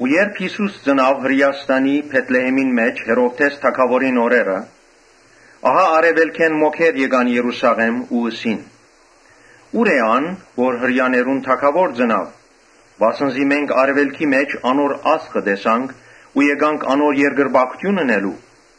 Երբ Յիսուս ծնաւ Հրէաստանի Բեթլէհէմին մէջ Հերովդէս թագաւորին օրերը, ահա արեւելքէն մոգեր եկան Երուսաղէմ, Ու ըսին. «Ո՞ւր տեղ է ան՝ որ Հրեաներուն թագաւոր ծնաւ. վասն զի մենք արեւելքի մէջ անոր աստղը տեսանք ու եկանք անոր երկրպագութիւն ընելու»։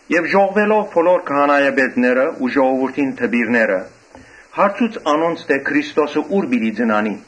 Ապա ժողվելով բոլոր քահանայապետները ու ժողովուրդին դպիրները, հարցուց անոնց թէ՝ Քրիստոսը ո՞ւր պիտի ծնանի։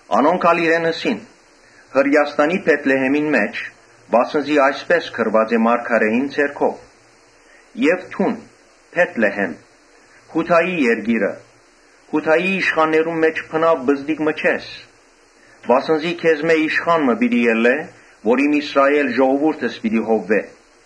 Անոնք ալ իրեն ըսին. «Հրէաստանի Բեթլէհէմին մէջ։ Վասն զի այսպէս գրուած է մարգարէին ձեռքով. ‘Դուն, Բե՛թլէհէմ, Յուդայի երկիր, Յուդայի իշխաններուն մէջ բնաւ պզտիկ մը չես. վասն զի քեզմէ իշխան մը պիտի ելլէ որ իմ Իսրայէլ ժողովուրդս պիտի հովուէ’»։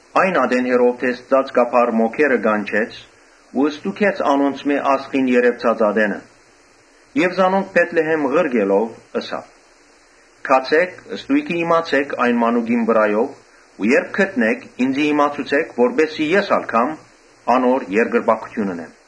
Այն ատեն Հերովդէս ծածկաբար մոգերը կանչեց ու ստուգեց անոնցմէ աստղին երեւցած ատենը։ Զանոնք Բեթլէհէմ ղրկելով՝ ըսաւ. «Գացէք ստոյգը իմացէք այն մանուկին վրայով ու երբ գտնէք, ինծի իմացուցէք, որպէս զի ես ալ երթամ, անոր երկրպագութիւն ընեմ»։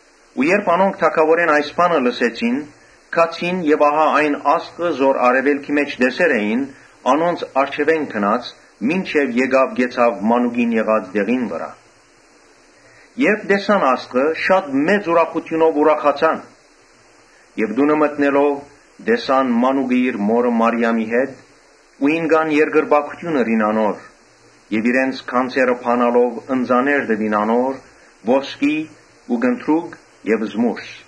Երբ անոնք թագաւորէն այս բանը լսեցին, գացին. եւ ահա այն աստղը որ արեւելքի մէջ տեսեր էին, անոնց առջեւէն գնաց, կեցաւ մանուկին եղած տեղին վրայ։ Երբ տեսան աստղը, շատ ուրախացան։ Տունը մտնելով՝ տեսան մանուկը իր մօրը Մարիամին հետ ու ինկան երկրպագութիւն ըրին անոր եւ իրենց գանձերը բանալով ընծաներ տուին անոր՝ ոսկի ու կնդրուկ եւ զմուռս։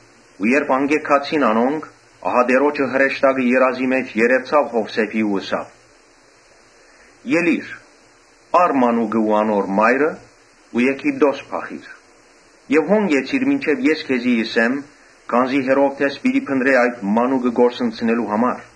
Երբ անկէ գացին անոնք, ահա Տէրոջը հրեշտակը երազի մէջ երեւցաւ Յովսէփին ու ըսաւ. «Ելի՛ր, առ մանուկը ու անոր մայրը ու Եգիպտոս փախիր, հոն կեցիր մինչեւ ես քեզի ըսեմ, քանզի Հերովդէս պիտի փնտռէ այդ մանուկը կորսնցնելու համար»։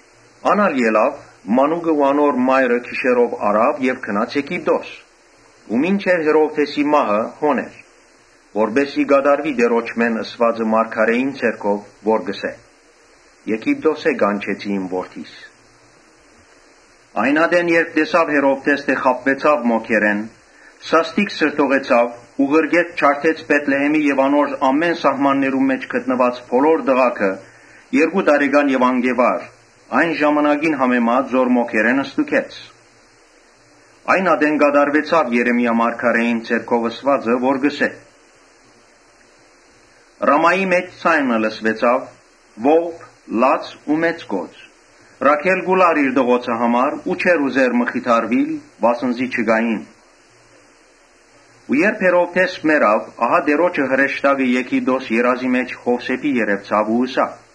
Ան ալ ելաւ, մանուկը ու անոր մայրը գիշերով առաւ, գնաց Եգիպտոս եւ մինչեւ Հերովդէսի մահը հոն էր։ Որպէս զի մարգարէին միջոցով Տէրոջմէն ըսուածը կատարուի, որ կ’ըսէ. «Եգիպտոսէն կանչեցի իմ որդիս»։ Երբ Հերովդէս տեսաւ թէ Յուն., ծաղրուեցաւխաբուեցաւ մոգերէն, սաստիկ սրդողեցաւ ու ղրկեց ջարդեց Բեթլէհէմի եւ անոր ամէն սահմաններուն մէջ գտնուած բոլոր տղաքը՝ երկու տարեկան եւ անկէ վար, այն ժամանակին համեմատ որ մոգերէն ստուգեց։ Այն ատեն կատարուեցաւ Երեմիա մարգարէին միջոցով ըսուածը, որ կ’ըսէ. «Ռամայի մէջ ձայն մը լսուեցաւ, ողբ, լաց ու մեծ կոծ. Ռաքէլ կու լար իր տղոցը համար ու չէր ուզեր մխիթարուիլ, վասն զի չկային»։ Երբ Հերովդէս մեռաւ, Տէրոջը հրեշտակը Եգիպտոսի մէջ Յովսէփին երեւցաւ ու ըսաւ.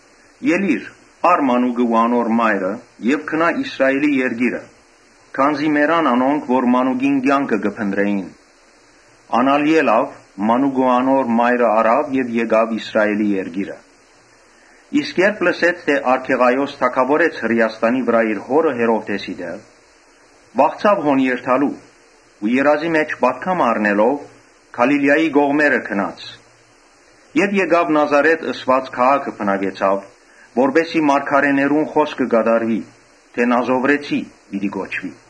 «Ելի՛ր, ա՛ռ մանուկը ու անոր մայրը եւ գնա Իսրայէլի երկիրը, քանզի մեռան անոնք որ մանուկին կեանքը կը փնտռէին»։ Ան ալ ելաւ, մանուկը ու անոր մայրը առաւ եւ դարձաւ Իսրայէլի երկիրը։ Իսկ երբ լսեց թէ Արքեղայոս թագաւորեց Հրէաստանի վրայ՝ իր հօրը Հերովդէսին տեղ, վախցաւ հոն երթալու ու երազի մէջ պատգամ առնելով՝ Գալիլիայի կողմերը գնաց. Եւ Նազարէթ ըսուած քաղաքը բնակեցաւ, որպէս զի մարգարէներուն խօսքը կատարուի՝ թէ ‘Նազովրեցի պիտի կոչուի’։